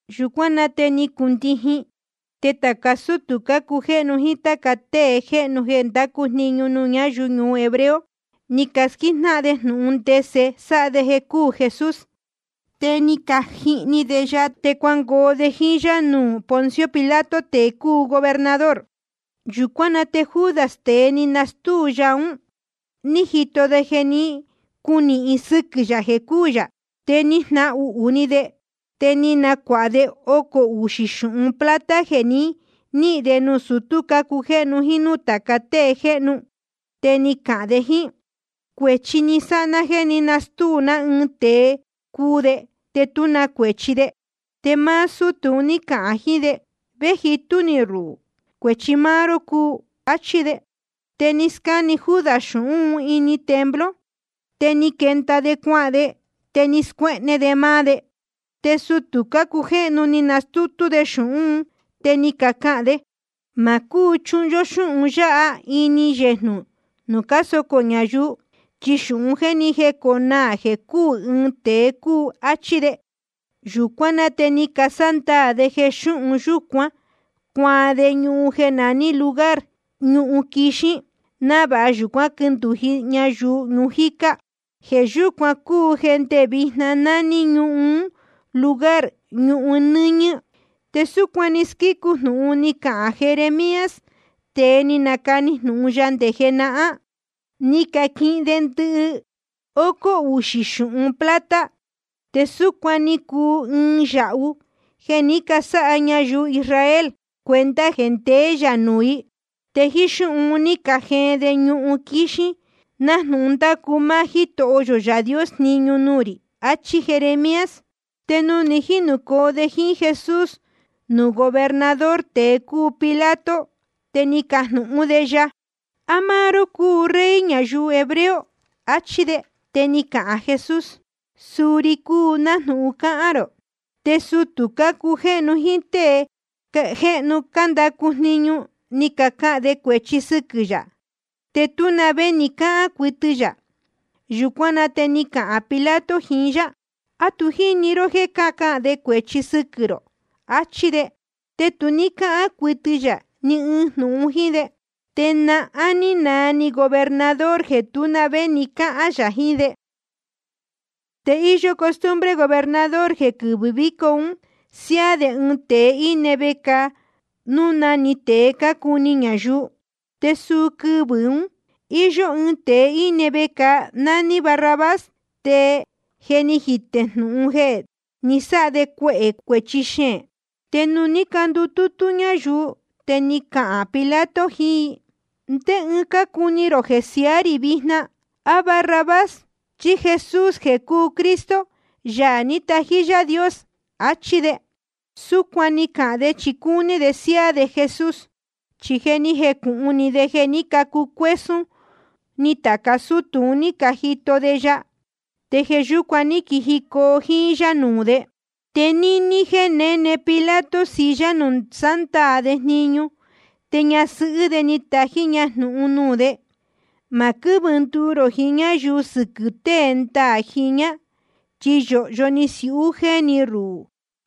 Yūcuán na te ni cundijin. Te tāca sútū cácujéhnu jíín táca tée jéhnu jeē cándacu jniñu nuū ñáyuu hebreo, ni casquíjnáhan de jnūhun ndese sáha de jeē cuu Jesús. Te ni cajihni de ya, te cuangoo de jíín yá nuū Poncio Pilato, tēe cúu gobernador. Yūcuán na te Judas, tēe ni nastúu ya un, ní jito de jeē ní cunīhin sɨquɨ̄ yā jeē cúū yā. Te ni jnahuhū ni de, te ni nacuāha de ocō uxī xūhun plata jeē ni níhīn de nuū sutú cácujéhnu jíín núū tāca tée jéhnu. Te ni cahān de jíín: Cuēchi ni sáha ná jéē ní nastúu ná ɨɨn tēe cuu de, te tú na cuēchi de. Te máá sútū un ní cacahān de: ¿Vé jitú ni ruhū? Cuēchi máá ró cúu. Achí de. Te ni scáne Judas xūhún un ini templo. Te ni quenda de cuahān de, te ni scuéhne de máá de. Te sutū cácujéhnu ni canastútú de xūhún un, te ni cacahān de: Ma cúu chuhun yó xúhun yáha ini yejnū nuū cásocō ñayuu, chi xūhun jéē ni jéconaā jeē cúū ɨɨn tēe cúu, áchí de. Yūcuán na te ni casándaā de jeē xūhun yúcuan cuaan de ñuhun jeē naní Lugar Ñuhun Quíxin, návāha yūcuán quindūji ñayuu ñuu jicá. Jeē yúcuan cúu jeē ndé vijna nání ñuhun ún Lugar Ñuhun Nɨñɨ̄. Te súcuan ni squícu jnūhun ni cahān Jeremías, tēe ni nacani jnūhun Yaā Dios nde jenahán: Ni caquihin de ndɨhócó uxī xūhun plata, te súcuan‑ni cúu ɨɨn yāhu jeē ní casáha ñayuu Israel cuenta jeē ndeé yā nuū i. Te jíín xúhun un ní cajeen de ñuhun quíxin, nájnūhun ni ndacu máá Jítoho yō Yaā Dios jniñu nuū rī. Achí Jeremías. Te nuū ní jinūcoo de jíín Jesús nuū gobernador, tēe cúu Pilato, te ni cajnūhún de ya: ¿A máá ró cúu Rey ñayuu hebreo? achí de. Te ni cahān Jesús: Suu ri cúu, nájnūhun cáhán rō. Te sutū cácujéhnu jíín tée jéhnu cándacu jniñu, ni cacahān de cuēchi sɨquɨ̄ yā. Te tú na vé ni cáhán cuɨtɨ yā. Yūcuán na te ni cahān Pilato jiín yá: ¿A tu jíni ró jéē cácahān de cuehē cuēchi sɨquɨ̄ rō? achí de. Te tu ní cáhán cuɨtɨ yā ni ɨɨn jnūhun jíín de. Te nahán ní naa ni gobernador jeē tú na vé ni cáhán yā jiín de. Te íyó costumbre gobernador jeē quɨvɨ̄ víco un siáá de ɨɨn tēe íne vecāa, núu na‑ni tēe cácuni ñayuu. Te suu quɨvɨ̄ un íyó ɨɨn tēe íne vecāa, nání de Barrabás, te je ni jitē núu jnūhun jeē ni sáha de cuēchi xeēn. Te nuū ní candutútú ñayuu, te ni cahān Pilato jiín i: ¿Ndé tée cácuni rō jeē siaá rī vijna: á Barrabás, chí Jesús jeē cúu Cristo, Yaā ní tají Yaā Dios? achí de. Súcuan ni cahān de chi cúní de siáá de Jesús. Chi je ni jecūhun ni de jeē ní cacucuésún ni tāca sútū un cájito de ya, te jeē yúcuan ní quijicoo jíín yá nuū de. Te níní jéē néne Pilato silla nuū sándaā de jniñu, te ñasɨhɨ́ de ni tají ña jnūhun nuū de: Ma quɨ́vɨ nduu rō jiín ñáyuu sɨquɨ̄ tée ndaā jiñā, chi yōhyo ni siūhu jéni ruhū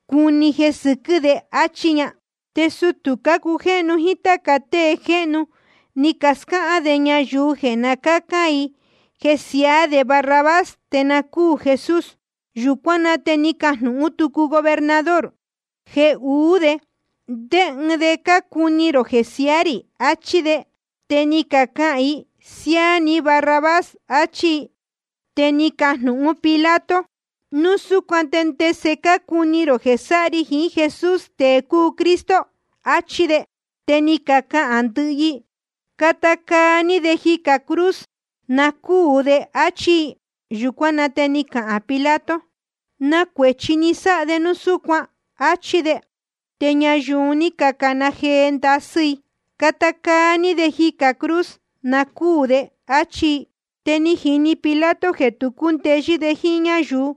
cuni jeē sɨquɨ́ de, áchí ña. Te sutū cácujéhnu jíín táca tée jéhnu, ni cascáhán de ñayuu jeē na cácán i jeē siaá de Barrabás, te na cúū Jesús. Yūcuán na te ni cajnūhún tucu gobernador: Jeē uú de, ¿ndé ɨɨn de cácuni rō jeē siaá rī? achí de. Te ni cacahān i: Siáá ni Barrabás, achí i. Te ni cajnūhún Pilato: Núu súcuan te ¿ndese cácuni rō jeē sáha ri jiín Jesús, tēe cúu Cristo? achí de. Te ni cacahān ndɨhɨ i: Cata caa ní de jicā cruz, na cúū de, áchí i. Yūcuán na te ni cahān Pilato: ¿Na cuēchi ni sáha de núu súcuan? áchí de. Te ñayuu un ní cacana jee ndasɨ́ i: Cata caa ní de jicā cruz, na cúū de, áchí i. Te ni jini Pilato jeē tu cúndeyɨ́ de jíín ñáyuu,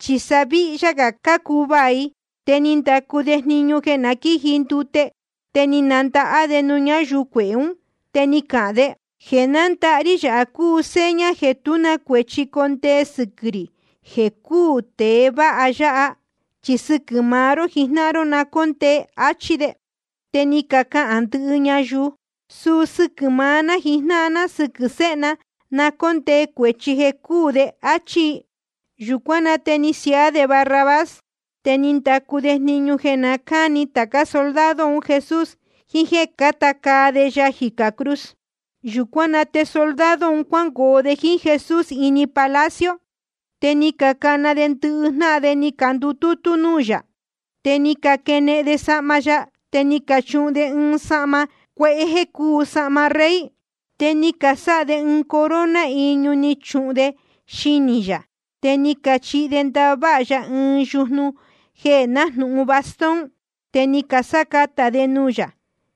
chi sa víhyá gā cácuvaā i. Te ni ndacu de jniñu jeē na quíji ndute, te ni nandahá de nuū ñáyuu cuehē ún. Te ni cahān de: Jeē nándahá rí yāha cúu seña jeē tú na cuēchi condee sɨquɨ̄ rī jeē cúū tēe vāha yāhá. Chi sɨquɨ̄ maá ró jijnáhan ró na cóndee. Achí de. Te ni cacahān ndɨhɨ ñayuu: Suu sɨquɨ̄ maá ná jíín sɨ́quɨ̄ séhe ná na cóndee cuēchi jeē cúū de, áchí i. Yūcuán na te ni siaá de Barrabás. Te ni ndacu de jniñu jeē na cáni tācá soldado un Jesús, jiín jéē cáta caa de ya jicā cruz. Yūcuán na te soldado un cuangoo de jíín Jesús ini palacio. Te ni cacana de ndɨhɨ jnáhan de ni candutútú núū yā. Te ni caquenehen de sahma ya, te ni cachuhun de ya ɨɨn sahma cuehé jeē cúu sahma rey. Te ni casáha de ɨɨn corona iñu, ni cachuhun de xinī yā. Te ni cachihi de ndaha váha ya ɨɨn yujnu jeē nájnūhun bastón. Te ni casácatā de nuū yā,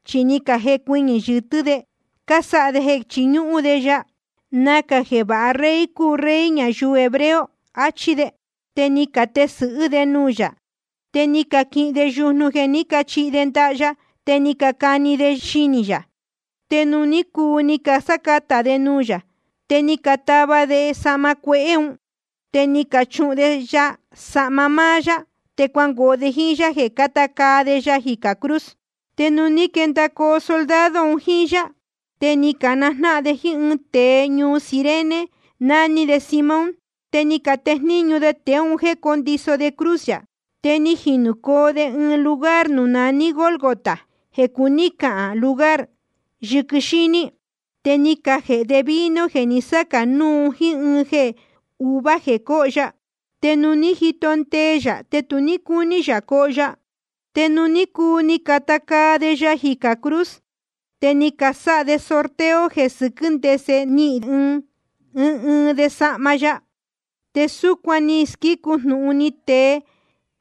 chi ni cajecuɨñɨ̄ yɨtɨ́ de, cásáha de jeē chiñúhún de ya. Nacā jeē váha rey cúu Rey ñayuu hebreo, achí de. Te ni catesɨ̄hɨ́ de nuū yā. Te ni caquihin de yujnu jeē ní cachihi de ndaha ya, te ni cacani de xinī yā. Te nuū ní cuu ni casácatā de nuū yā, te ni catava de sahma cuehé un, te ni canachuhun de ya sahma máá yá. Te cuangoo de jíín yá jeē cata caa de ya jicā cruz. Te nuū ní quendacoo soldado un jíín yá, te ni canajnáhan de jíín ɨɨn tēe ñuu Cirene, naní de Simón. Te ni catejníñu de tēe un jéē cóndiso de cruz yā. Te ni jinūcoo de ɨɨn lugar nuū naní Gólgota, jeē cuní cahān Lugar Yɨquɨ Xíní. Te ni cajēhe de vino jeē ni sácā núu jíín ɨɨn jeē uvuá jeē cóho ya. Te nuū ní jito ndee ya, te tu ní cúní yā coho ya. Te nuū ní cuu ni cacata caa de ya jicā cruz, te ni casáha de sorteo jeē sɨquɨ́ ndese nihīn ɨɨn ɨɨn de sahma ya. Te súcuan ni squícu jnūhun ni tee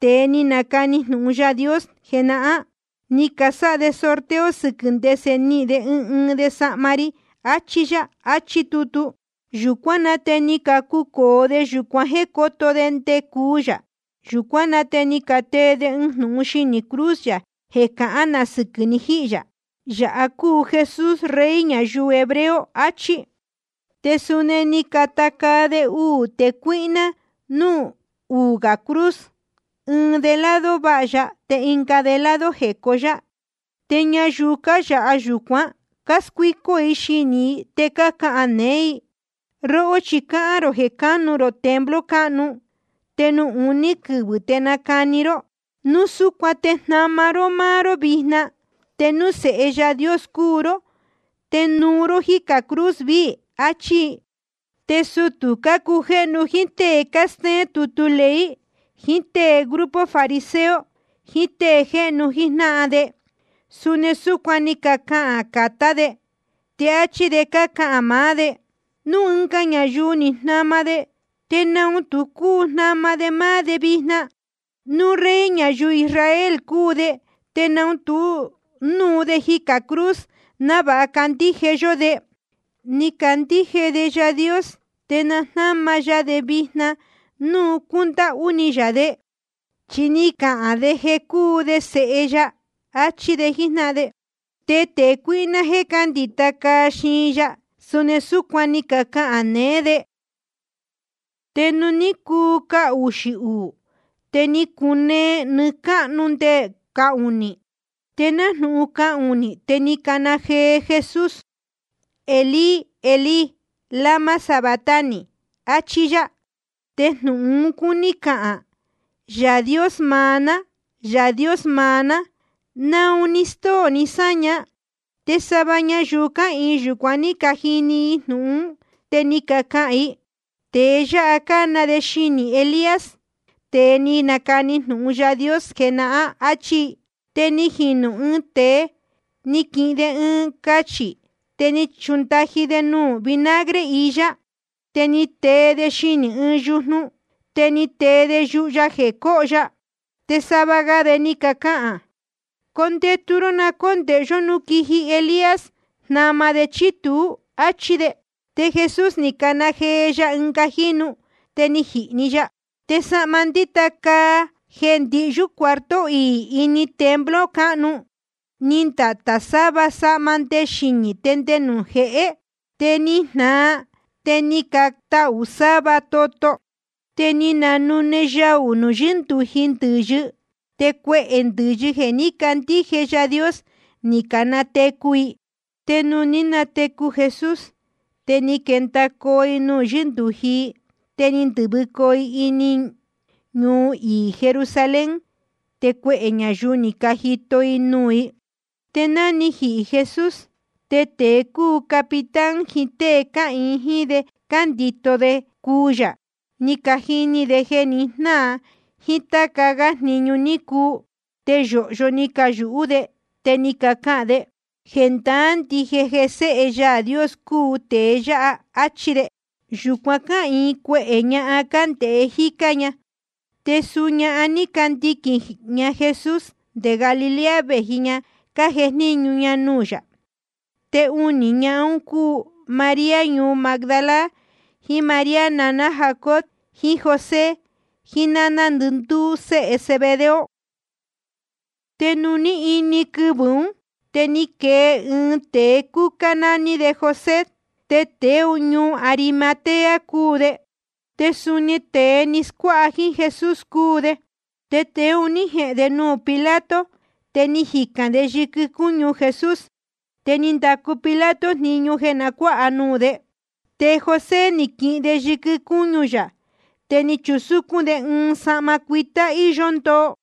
tēe ni nacani jnūhun Yaā Dios jenahán: Ni casáha de sorteo sɨquɨ̄ ndese nihīn ɨɨn ɨɨn de sahma ri, achi yā, achí tutu. Yūcuán na te ni cacucōo de yūcuan jéē cóto de nde cuu yā. Te ni catee de ɨɨn jnūhun xinī cruz yā jeē cahán na sɨquɨ̄ ni jíhī yā: Yāha cúu Jesús, Rey ñayuu hebreo, achí. Te suni ni cacata caa de uū tēe cuíhná núū uū gā cruz, ɨɨn de lado váha ya, te ɨnga de lado jecó yá. Te ñayuu cáyāha yūcuan cáscuícó i xinī i, te cácahān neé i: Róhó chi cáhán rō jeē cánu rō templo cáhnu, te nuū uní quɨvɨ̄ te nacani ró. Núu súcuan te jnama ró máá ró vijna. Te núu Sēhe Yaā Dios cúu ró, te nuu ró jícā cruz viī, achí i. Te sutū cácujéhnu, jíín tée cástéén tutu ley, jiín tée grupo fariseo, jiín tée jéhnu jíjnáhan de, suni súcuan ni cacahān catá de, te áchí de cácahān maá de: Núu ɨnga ñayuu ni jnama de, ¿te naun tu cúu jnama de máá de vijna? Núu Rey ñayuu Israel cúu de, te na núu de jicā cruz, návāha candíje yó de. Ni candíje de Yaā Dios, te na jnáma ya de vijna te núu cúndáhú ni yā de, chi ni cahān de jeē cúu de Sēhe ya. Achí de jíjnáhan de. Te tēe cuíhná jeē cándita caa xiin ya, suni súcuan ni cacahān neé de. Te nuū ní cuu cahuxī uū, te ni cunee nɨɨ́ cáhnu nde cahunī. Te nájnūhun cahunī, te ni cana jee Jesús: Elí, Elí, ¿lama sabactani? achí yá. Te jnūhun un cúní cahān: Yaā Dios maá ná, Yaā Dios maá ná, ¿naun ni stóo ní sáña? Te sava ñayuu cáhīin yūcuan ní cajini i jnūhun ún, te ni cacahān i: Tēe yáha cána de xinī Elías, tēe ni nacani jnūhun Yaā Dios jenahán, áchí i. Te ni jinu‑ni ɨɨn tēe, ni jequihin de ɨɨn cachī, te ni chundaji de nuū vinagre iyá. Te ni tee de xinī ɨɨn yujnu, te ni tee de yuhu ya jeē coho ya. Te sava ga de ni cacahān: Condetu ró, na cóndēhe yó núu quiji Elías jnama de chí tuú, áchí de. Te Jesús ni cana jee ya ɨnga jínu, te ni jihī‑ni ya. Te sahma ndíta caa jeē ndihyú cuarto iī ini templo cáhnu, ni ndatā‑ni sava sava nde xinī te nde nuū jehé. Te ni jnāa, te ni catahū sáva toto. Te ni cananune yaū nuū yɨ́ndūji ndɨ̄yɨ. Te cuehē ndɨ̄yɨ jeē ní cacandíje i Yaā Dios, ni canatecu i. Te nuū ní natecu Jesús, te ni quendacoo i nuū yɨ́ndūji i. Te ni ndɨ̄vɨcoo i ini ñuu iī Jerusalén, te cuehē ñayuu ni cajito nuū i. Te ná ni jihī Jesús, te tēe cúu capitán jiín tée cáhīin jíín de jeē cándito de nde cuu yā, ni cajini de jeē ni jnáa, jíín táca gá jniñu ní cuu. Te yōhyo ni cayūhú de, te ni cacahān de: Jendaá ndije jeē Séhe Yaā Dios cúu tēe yáha, áchí de. Te yūcuan cáhīin cuehē ñahan, cándēhe jícá ña. Te suu ñahan un ní candiquīn ña Jesús nde Galilea, vējicoo ña cájejníñu ña nuū yā. Te unī ñahan un cácuu María ñuu Magdala, jiín María naná Jacobo jiín José, jiín náná ndɨndúú séhe Zebedeo. Te nuū ní ini quɨvɨ̄ ún, te ni quee ɨɨn tēe cúcá, nání de José, te tēe ñuu Arimatea cúu de. Te suni tēe ni scuáha jíín Jesús cúu de. Tēe un ní jehēn de nuū Pilato, te ni jicān de yɨquɨ cúñu Jesús. Te ni ndacu Pilato jniñu jeē na cuáha nuū de. Te José ni quihin de yɨquɨ cúñu yā, te ni chusúcún de ɨɨn sahma cuitá íyó ndoo.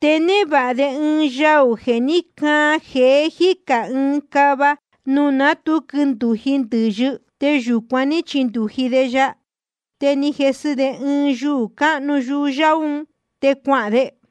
Te névāha de ɨɨn yaū jeē ní caan jeé jícā ɨɨn cava, nuū ná tu quindūji ndɨ̄yɨ. Te yūcuan ní chindūji de ya. Te ni jesɨ de ɨɨn yuū cáhnu yuhu yáú un, te cuahān de.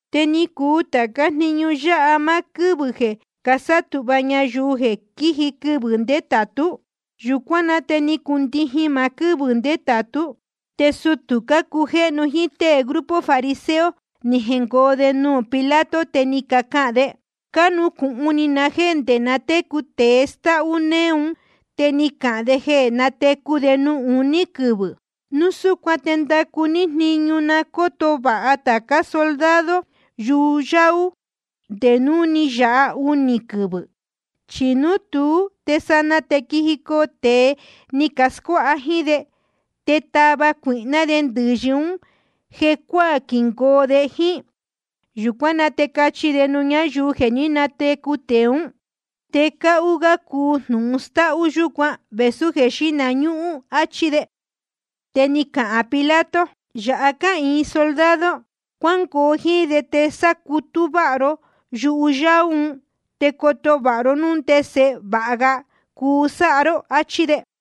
Te ni cuu tācá jniñu yáha máá quɨ́vɨ̄ jeē casátūhva ñayuu jeē quiji quɨvɨ̄ ndétātú. Yūcuán na te ni cundijin maá quɨ́vɨ̄ ndétātú. Te sutū cácujéhnu jíín tée grupo fariseo ni jengoo de nuū Pilato. Te ni cacahān de: Cánucūhun ni na jéē nde na técu tēe stáhú néé un te ni cahān de jeē nátecu de nuū uní quɨvɨ̄. Núu súcuan te ndacu ní jniñu na cóto vāha tācá soldado yuhu yáú un nde núu ni yāha unī quɨvɨ̄. Chi núu tuú te sanaa te quijicoo tēe ni cascuáha jíín de, te tava cuīhná de ndɨ̄yɨ ún jecuáā, quingoo de jíín. Yūcuán na te cachi de nuū ñáyuu jeē ní natecu tēe ún. Te cáhú gá cuu jnūhun stáhú yúcuan vēsú jeē xíhna ñúhún. Achí de. Te ni cahān Pilato: Yāha cáhīyo soldado. Cuángoo jíín de, te sácutú váha ró yuhu yáú un, te coto vāha ró, núu ndese vāha ga cuu sáha ró. Achí de.